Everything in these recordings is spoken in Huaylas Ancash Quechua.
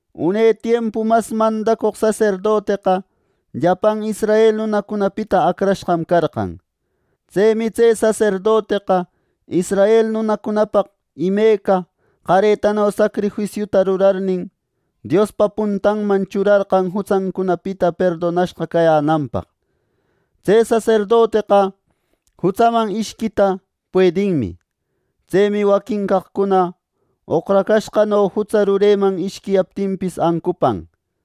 Une tiempu mas mandacoq saserdoteqa llapan israel nunacunapita acrashqam carqan. Tsemi tse saserdoteqa israel nunacunapaq imeca qaretano sacrifisiuta rurarnin, Diospa puntanman churarqan jutsancunapita perdonashqa cayänanpaq. Tse saserdoteqa jutsaman ishquita puedinmi. Tsemi waquin caqcuna oqracashqano jutsa rureman ishquiyaptinpis ancupan.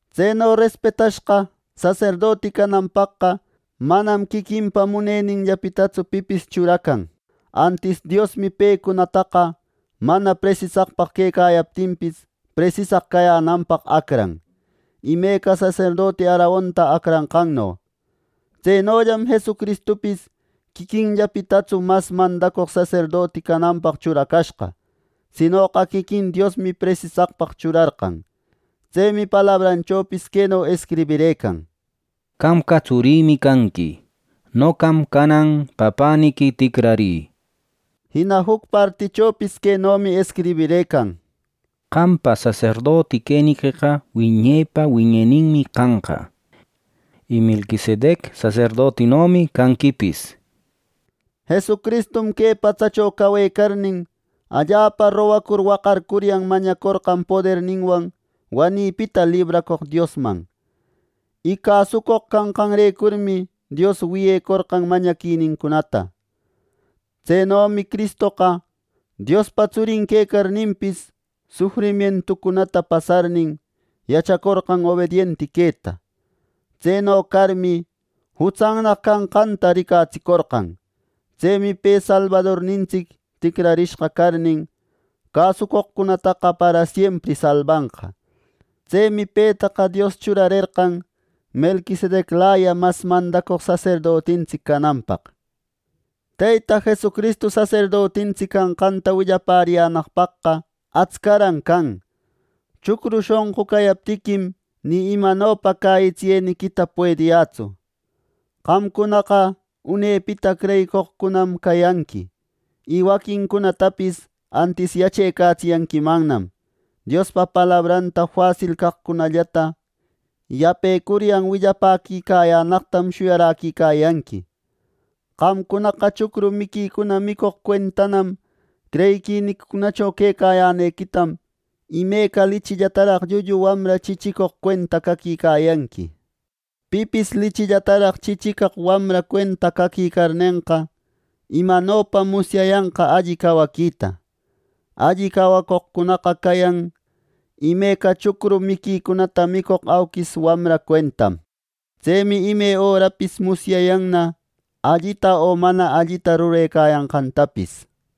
Tseno respetashqa saserdoti cananpaqqa manam quiquinpa muneninllapitatsu pipis churacan. Antis Diosmi pecunataqa mana presisaq quecayaptinpis, presisaq cayänanpaq acran, imeca saserdoti Aaronta acranqanno. Tsenollam Jesucristupis quiquinllapitatsu mas mandacoq saserdoti cananpaq churacashqa. Sinoqa quiquin Diosmi presisaqpaq churarqan. Tsemi palabranchopis queno escribirëcan: “Qamqa tsurïmi canqui. Noqam canan papäniqui ticrarï” nishpa. Jina juc partichopis quenomi escribirëcan: “Qampa saserdoti queniqueqa wiñepa, wiñeninmi canqa, y Melquisedec saserdotinomi canquipis” nishpa. Jesucristum que patsacho cawecarnin allapa rogacur waqarcuryan mañacorqan poderninwan wanïpita libracoq Diosman. Y cäsucoq canqanrecurmi Dios wiyecorqan mañaquinincunata. Tsenomi Cristoqa Diospa Tsurin quecarninpis, sufrimientucunata pasarnin, yachacorqan obedienti queta. Tseno carmi, jutsannaq canqanta ricatsicorqan. Tsemi pe Salbadornintsic ticrarishqa carnin, cäsucoqcunata parasiempri salbanqa. Tsemi petaqa Dios churarerqan Melquisedeclaya mas mandacoq saserdotintsic cananpaq. Teyta Jesucristu saserdotintsic canqanta willapäriyänaqpaqqa atscaran can. Chucru shonqu cayaptiquim, ni imanopa cäyitsiyeniquita puediyätsu. Qamcunaqa unepita creyicoqcunanam cayanqui, y waquincunatapis antis yachecatsiyanquimannam. Diospa palabranta facil caqcunallata yapecuryan willapäquicayänaqtam shuyaräquicayanqui. Qamcunaqa chucru miquicuna micoq cuentanam creyiquiniquicunacho quecayänequitam imeca lichillataraq llullu wamra chichicoq cuenta caquicayanqui. Pipis lichillataraq chichiquicaq wamra cuenta caquicarnenqa, ¿imanopam musyayanqa alli cawaquita! Alli cawacoqcunaqa cayan imeca chucru miquicunata micoq auquis wamra cuentam. Tsemi ime örapis musyayanna, allita o mana allita rurecayanqantapis.